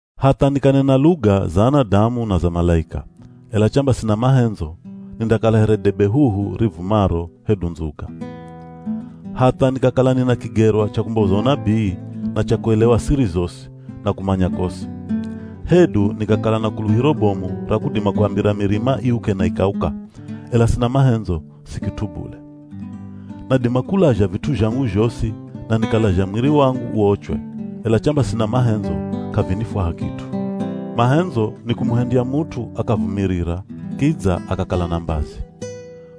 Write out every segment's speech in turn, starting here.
Hatha nikanena luga za anadamu na za malaika, ela chamba sina mahendzo, nindakala here debe huhu rivumaro hedu ndzuga. Hatha nikakala nina kigerwa cha kumboza unabii, na cha kuelewa siri zosi, na kumanya kosi. Hedu nikakala na kuluhiro bomu ra kudima kuambira mirima iuke na ikauka, ela sina mahendzo, si kit'u bule. Nadima kulazha vit'u zhangu zhosi na nikalazha mwiri wangu uochwe, ela chamba sina mahendzo k'avinifwaha kit'u. Mahendzo, nikumuhendya mut'u akavumirira kidza akakala na mbazi.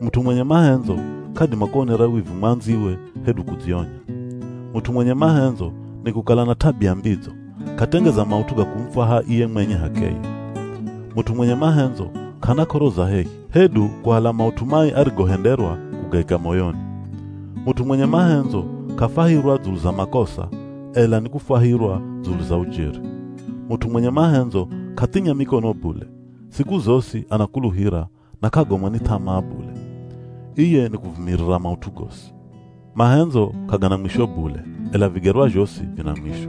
Mut'u mwenye mahendzo k'adima kuonera wivu mwandziwe hedu kudzionya. Mut'u mwenye mahendzo nikukala na t'abia mbidzo, k'atengeza maut'u ga kumufwaha iye mwenye h'akeye. Mut'u mwenye mahendzo k'ana k'oro za hehi, hedu kuhala maut'u mai arigohenderwa kugaika moyoni. Mut'u mwenye mahendzo k'afwahirwa dzulu za makosa ela ni kufwahirwa dzulu za ujeri. Mut'u mwenye mahendzo k'athinya mikono bule, siku zosi anakuluhira, na k'agomwa ni th'amaa bule. Iye nikuvumirira maut'u gosi. Mahendzo k'agana mwisho bule, ela vigerwa zhosi vina mwisho.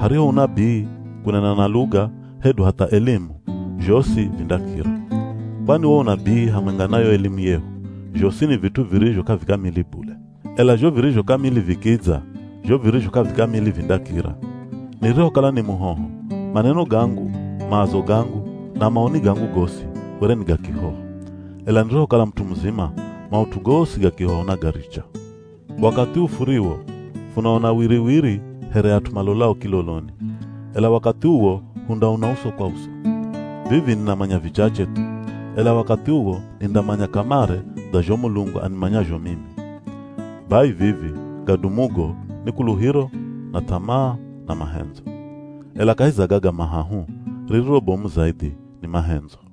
Hariho unabii, kunena na luga, hedu hatha elimu, zhosi vindakira. Kwani wo unabii hamwenga na yo elimu yehu, zhosi ni vit'u virizho k'avikamili bule. Ela zho virizho kamili vikidza, zho virizho k'avikamili vindakira. Nirihokala ni muhoho, maneno gangu, maazo gangu, na maoni gangu gosi were ni ga kihoho. Ela nirihokala mut'u muzima, maut'u gosi ga kihoho nagaricha. Wakathi uu furiwo, funaona wiriwiri here at'u malolao kiloloni. Ela wakathi uwo hundaona uso kwa uso. Vivi ninamanya vichache thu, ela wakathi uwo nindamanya kamare dza zho Mulungu animanyazho mimi. Bai vivi, gadumugo ni kuluhiro, na th'amaa, na mahendzo. Ela kahi za gaga mahahu, ririro bomu zaidhi ni mahendzo.